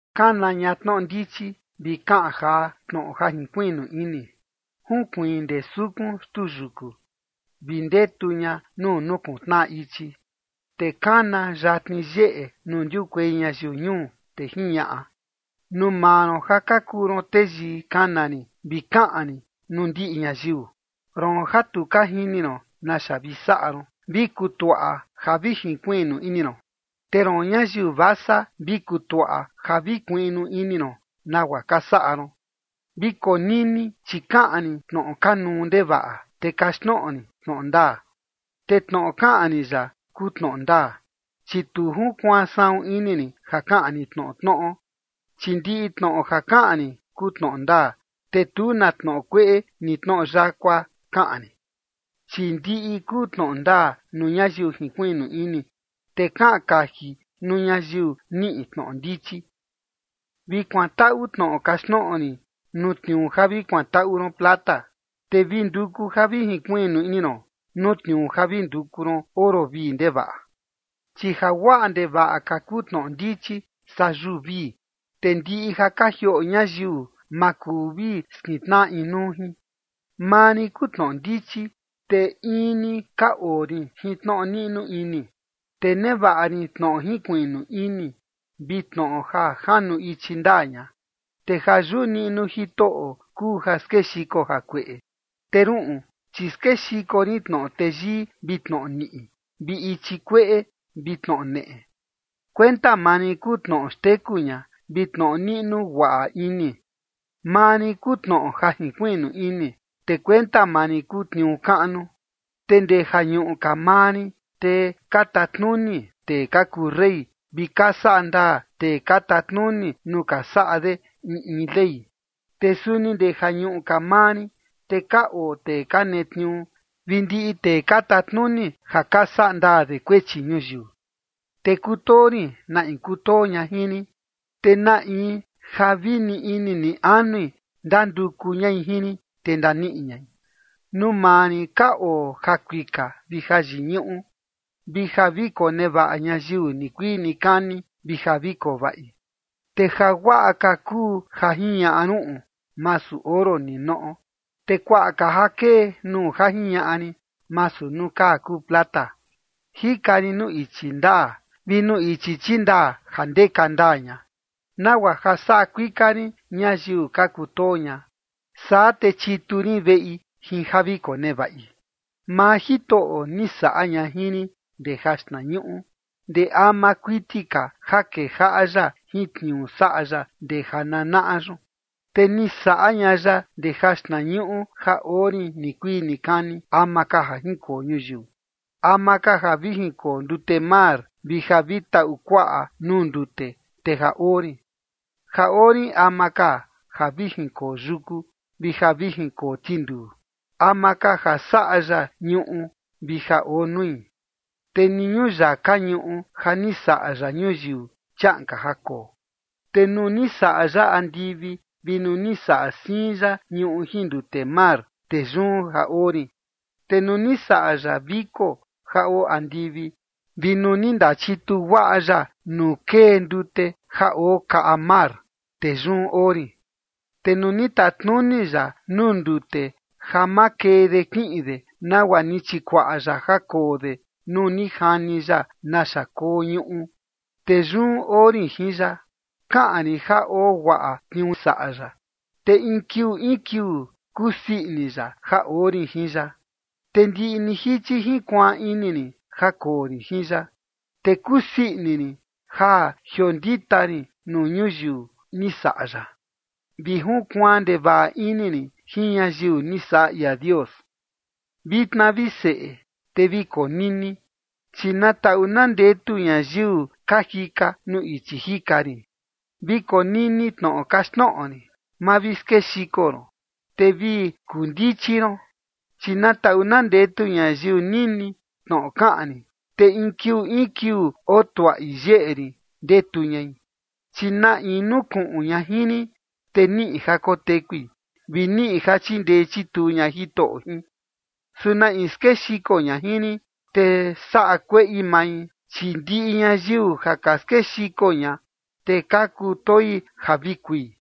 Kana ña tnoꞌo ndichi, vi kaꞌan jaa tnoꞌo ja jinkuiꞌnu ini. Junkuiin ndee sukun xtuu yuku vi ndetu ña nuu nukuntnaꞌa ichi, te kana yatni yeꞌe nuu ndiukuei ñayiu ñuu, te jiñaꞌa: “Nuu maa ron ja ka kuu ron teyii, kana rin, vi kaꞌan rin nuu ndiꞌi ñayiu. Roon ja tu ka jini ron naxa vi saꞌa ron, vi kutuaꞌa ja vi jinkuiꞌnu ini ron. Te roon ñayiu vasa, vi kutuaꞌa ja vi kuiꞌnu ini ron nagua ka saꞌa ron. Vi konini, chi kaꞌan rin tnoꞌo kanuu ndevaꞌa, te kaxtnoꞌo rin tnoꞌo ndaa. Te tnoꞌo kaꞌan rin yaꞌa kuu tnoꞌo ndaa, chi tu junkuaan saꞌun ini rin ja kaꞌan rin tnoꞌo tnoꞌo. Chi ndiꞌi tnoꞌo ja kaꞌan rin kuu tnoꞌo ndaa, te tu na tnoꞌo kueꞌe ni tnoꞌo yakua kaꞌan rin. Chi ndiꞌi kuu tnoꞌo ndaa nuu ñayiu jinkuiꞌnu ini, te kaꞌan kaji nuu ñayiu niꞌi tnoꞌo ndichi. Vi kuantaꞌu tnoꞌo kaxtnoꞌo rin nuu tniuu ja vi kuantaꞌu ron plata, te vi nduku ja vi jinkuiꞌnu ini ron nuu tniuu ja vi nduku ron oro vii ndevaꞌa.” Chi ja guaꞌa ndevaꞌa ka kuu tnoꞌo ndichi saa yuu vii, te ndiꞌi ja ka jioꞌo ñayiu ma kuu vi skintnaꞌa inuu jin. “Maa rin kuu tnoꞌo ndichi, te in ni ka oo rin jin tnoꞌo niꞌnu ini, te nevaꞌa rin tnoꞌo jinkuiꞌnu ini vi tnoꞌo ja janu ichi ndaa ña. Te ja yuꞌu niꞌnuo Jitoꞌo kuu ja skexiko jakueꞌe, te ruꞌun, chi skexiko rin tnoꞌo teyii vi tnoꞌo niꞌi vi ichi kueꞌe vi tnoꞌo neꞌe. Kuenta maa rin kuu tnoꞌo xteku ña, vi tnoꞌo niꞌnu guaꞌa ini. Maa rin kuu tnoꞌo ja jinkuiꞌnu ini, te kuenta maa rin kuu tniuu kaꞌnu. Te ndee jañuꞌu ka maa rin, te ka tatnuni tee ka kuu rey, vi ka saꞌa ndaa tee ka tatnuni nuu ka saꞌa de in in ley. Te suni ndee jañuꞌu ka maa rin, te ka oo tee ka netniuu, vi ndiꞌi tee ka tatnuni ja ka saꞌa ndaa de kuechi ñuyiu. Te kutoo rin na in kutoo ña jin rin, te na in ja vi ni ini ni anui ndanduku ñai jin rin, te ndaniꞌi ñai. Nuu maa rin ka oo jakuika vi jayiñuꞌu, vi ja vi konevaꞌa ñayiu nikuii nikani, vi ja vi koo vaꞌi. Te jaguaꞌa ka kuu ja jiñaꞌa ruꞌun, masu oro ninoꞌo, te kuaꞌa ka ja kee nuu ja jiñaꞌa rin, masu nuu kaa kuu plata. Jika rin nuu ichi ndaa, vi nuu ichi chindaa ja ndeka ndaa ña, nagua ja saꞌa kuika rin ñayiu ka kutoo ña, saa te chitu rin veꞌi jin ja vi konevaꞌi. ’Maa Jitoꞌo ni saꞌa ña jin rin ndee jaxtnañuꞌu, ndee ama kuiti ka ja kejaꞌa ya jin tniuu saꞌa ya ndee jananaꞌa yun. Te ni saꞌa ña ya ndee jaxtnañuꞌu ja oo rin nikuii nikani, ama ka ja jinkoo ñuyiu. Ama ka ja vi jinkoo ndute mar, vi ja vi taꞌu kuaꞌa nuu ndute, te ja oo rin. Ja oo rin ama ka ja vi jinkoo yuku, vi ja vi jinkoo tinduu, ama ka ja saꞌa ya ñuꞌu vi ja oo nui, te ni ñuyaka ñuꞌu ja ni saꞌa ya ñuyiu, chiaꞌan ka ja koo. Te nuu ni saꞌa ya andivi vi nuu ni saꞌa siin ya ñuꞌu jin nuu ndute mar, te yun ja oo rin. Te nuu ni saꞌa ya viko ja oo andivi vi nuu ni ndachituu guaꞌa ya nuu kee ndute ja oo kaꞌa mar, te yun oo rin. Te nuu ni tatnuni ya nuu ndute ja ma kee de kiꞌin de, nagua ni chikuaꞌa ya ja koo de nuu ni jani ya naxa koo ñuꞌu, te yun oo rin jin ya, kaꞌan rin ja oo guaꞌa tniuu saꞌa ya, te in kiuu in kiuu kusii ini ya ja oo rin jin ya. Te ndiꞌi ni jichi jinkuaan ini rin ja koo rin jin ya. Te kusii ini rin ja jiondita rin nuu ñuyiu ni saꞌa ya, vi junkuaan ndevaꞌa ini rin jin ñayiu ni saꞌa ia Dios.” ’Vitna, vi seꞌe, te vi konini, chi na taꞌu na ndetu ñayiu ka jika nuu ichi jika rin. Vi konini tnoꞌo kaxtnoꞌo rin, ma vi skexiko ron, te vi kuu ndichi ron. Chi na taꞌu na ndetu ñayiu nini tnoꞌo kaꞌan rin, te in kiuu in kiuu oo tuaꞌi yeꞌe rin ndetu ñai. Chi na in nukuꞌun ña jin rin, te niꞌi ja kotekui, vi niꞌi ja chindee chituu ña Jitoꞌo jin. Su na in skexiko ña jin rin, te saꞌa kueꞌi mai, chi ndiꞌi ñayiu ja ka skexiko ña, te ka kutoi ja vi kui.”